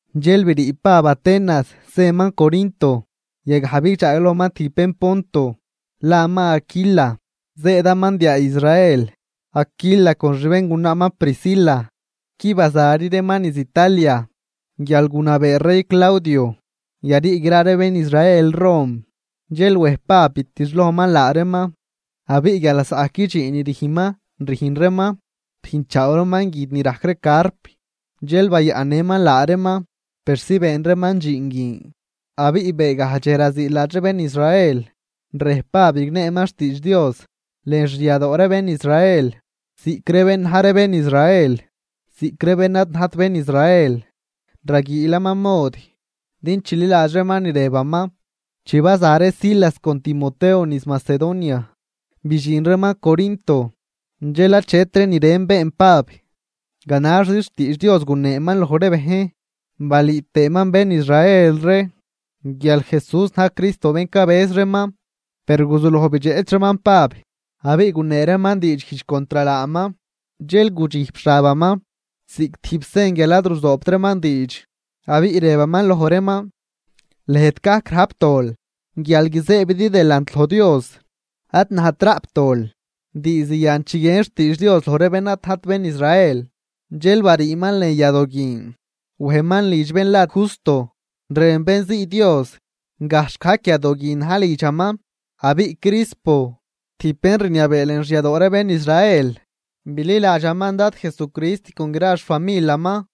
Dxel brii Pab Atenas zëman Corinto. Yagaj bidxaaglojman tijb bén Ponto laman Aquila, zëëdaman diaa Israel. Aquila con xbéngunaaman Priscila qui bazari reeman niz Italia guial gunabee rey Claudio yarii gra ree bén Israel Rom. Dxel wej Pab bitixlojman laa reeman. Abiꞌ guial lasaꞌgajc dxiin ni rüjnman rüjn reeman, rüjnchaaw reeman guid ni rajc ree carp, dxel bayaꞌnnëman laa reeman persi been reeman dxiin guin. Abiꞌ beegaj dxej raziiladx ree bén Israel, rej Pab rigneeman xtiidx Dios lën xyadoo ree bén Israel, ziꞌc ree bén na̱j ree bén Israel ziꞌc ree bén ad najt bén Israel raguiilaman mod din chililadx reeman ni rëbaman. Chi baza ree Silas con Timoteo niz Macedonia, bidxin reeman Corinto, dxel achetri ni ren been Pab, ganaxzi xtiidx Dios guneeman loj ree bejn, balüü tëëman bén Israel ree guial Jesús na̱j Cristo bén cabëz reeman. Per guzuloj bidxeꞌch reeman Pab abiꞌ gunee reeman diidxguijdx contr laaman. Dxel gudxijp xabaman ziꞌc tijb sen guial ad ruzoobt reeman diidx, abiꞌ rëbaman loj reeman: ―Lëjt gajc rajp dol guial guizëëbidi delant loj Dios, ad najt raꞌp dol. Diizd yan chiguien xtiidx Dios loj ree bén ad najt bén Israel. Dxel bariiman lën yadoo guin wejman lidx bén la Justo, rën bén zii Dios, gajxh gajc yadoo guin na̱j lidxaman. Abiꞌ Crispo, tijb bén rniabee lën xyadoo ree bén Israel, bililadxaman Dad Jesucrist con gra xfamilaman.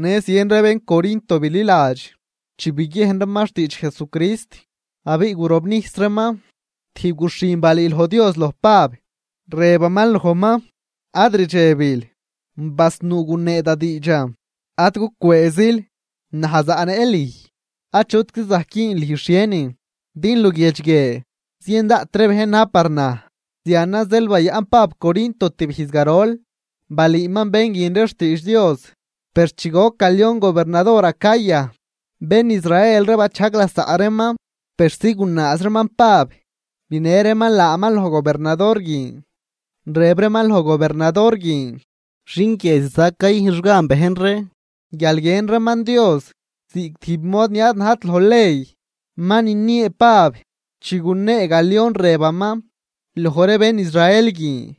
Në zien ree bén Corinto bililadx chi biguiejn reeman xtiidx Jesucrist abiꞌ gurobnijs reeman. Tijb guxhin balüüloj Dios loj Pab, rëbaman lojman: ―Ad rdxebil, basnuu gunee da diidxan, ad gucwëëzil, naj zaꞌnëꞌ lüj, achutczi zajc güün lüj xhienin, din luguiedx guie zien daꞌt bejn na̱j par naj. Zianan zeel bayaꞌn Pab Corinto tibijz garol, balüüman bén guin ree xtiidx Dios. Per chi goc Galión gobernador Acaya, bén Israel ree bachajg lasaꞌ reeman persi gunaaz reeman Pab binë reeman laaman loj gobernador guin, rëb reeman loj gobernador guin: ―Xin guie ziza cayüjnx gan bejn ree guial guiën reeman Dios ziꞌc tijb mod ni ad najt loj ley. Ma niniee Pab, chi gunee Galión rëbaman loj ree bén Israel guin: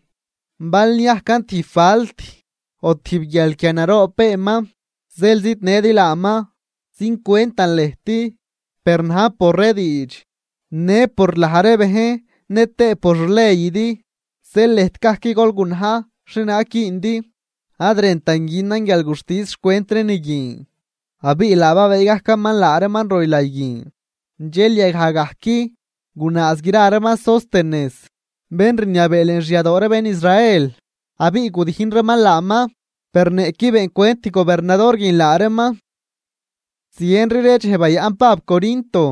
―Bal niajcan tijb falt o tijb guialquia naroob beenman zeel zidnëdi laaman, züncwentan lëjt. Per najn por ree diidx në por laj ree bejn nëtëë por xleydi, zeel lëjt gajc gol gunaj xhienaag güündi, ad rëntan günan guialguxtis xcwent ree ni guin. Abiꞌ laa babëë gajcaman laa reeman roylay guin. Dxel yagaj gajc gunaaz gra reeman Sóstenes, bén rniabee lën xyadoo ree bén Israel abiꞌ gudijn reeman laaman, per niꞌquid beencwentt gobernador guin laa reeman. Zienri ree dxej bayaꞌn Pab Corinto.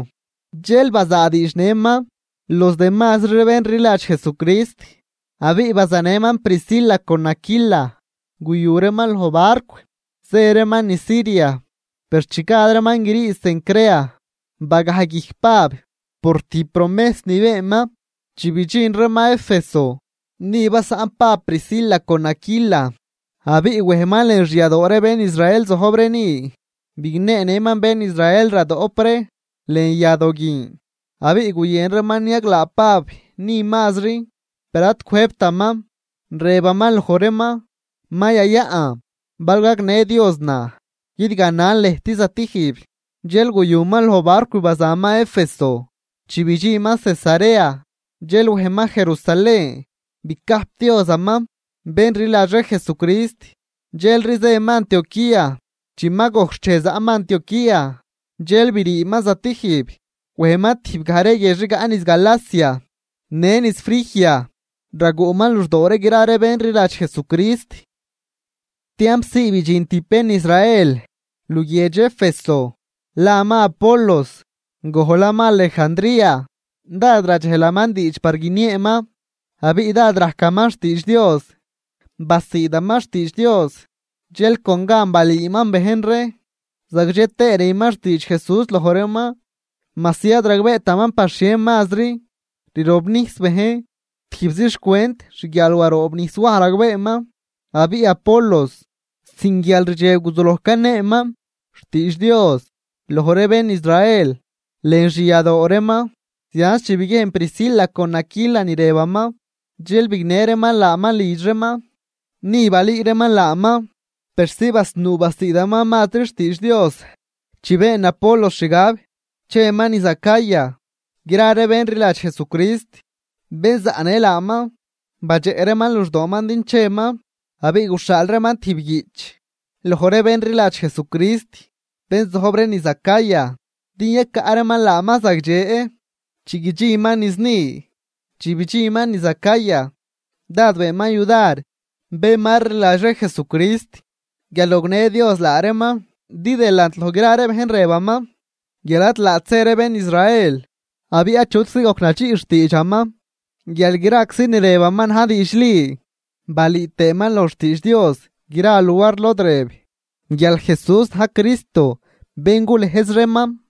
Dxel bazaadiidx nëman los demazri ree bén rliladx Jesucrist, abiꞌ bazanëman Priscila con Aquila, guyu reeman loj barcw zë reeman niz Siria. Per chi gad reeman grii Cencrea bagaj guijc Pab, por tijb promejs ni beenman. Chi bidxin reeman Éfeso, ni basaꞌn Pab Priscila con Aquila, abiꞌ wejman lën xyadoo ree bén Israel zojb ree ni, bigneenëman bén Israel radoꞌp ree lën yadoo guin. Abiꞌ guyën reeman niaglaa Pab ni mazri, per ad cwëjbtaman. Rëbaman loj reeman: ―Ma yayaꞌn, bal gagnë Dios naj, guidganan lëjt stijb. Dxel guyuman loj barcw bazaman Éfeso. Chi bidxinman Cesarea, dxel wejman Jerusalén bicajpdiozaman bén rliladx ree Jesucrist, dxelri zëman Antioquía. Chi ma gojc xchej zaꞌman Antioquía, dxel briiman zatijb. Wejman tijb gaj ree guiedx rigaꞌ niz Galacia në niz Frigia, raguꞌman luxdoo gra ree bén rliladx Jesucrist. Tiamp zii bidxin tijb bén Israel luguiedx Éfeso, laman Apolos, gojlaman Alejandría. Dád radxejlaman diidx par guinieeman abiꞌ dád rajcaman xtiidx Dios. Basiidaman xtiidx Dios, dxel con gan balüüman bejn ree, zagdxe tëë rüman xtiidx Jesús loj reeman, majsi ad ragbeetaman par xhieri mazri rirobnijs bejn, tijbzi xcwent xguial waroobnijs Waj ragbeeman. Abiꞌ Apolos, sin guialrdxeb guzuloj caneeman xtiidx Dios loj ree bén Israel lën xyadoo reeman, zianz chi biguiejn Priscila con Aquila ni rëbaman, dxel bignë reeman laaman lidx reeman. Ni balüü reeman laaman persi basnuu basiidaman mazri xtiidx Dios. Chi been Apolos xgab cheman niz Acaya, gra ree bén rliladx Jesucrist bén zaꞌnë laaman, badxeꞌ reeman luxdooman din cheman, abiꞌ guxhaal reeman tijb guiꞌch loj ree bén rliladx Jesucrist bén zojb ree niz Acaya din yacaꞌ reeman laaman zagdxe chi guidxinman niz ni. Chi bidxinman niz Acaya dád beenman yudar bén ma rliladx ree Jesucrist guial gognë Dios laa reeman. Din delant loj gra ree bejn rëbaman guial ad laat zë ree bén Israel, abiꞌ achutczi gojc nadxiꞌ xtiidxaman guial graczi ni rëbaman na̱j diidxli, balüü tëëman loj xtiidx Dios gra luar lod rëb guial Jesús na̱j Cristo bén gulëjz reeman.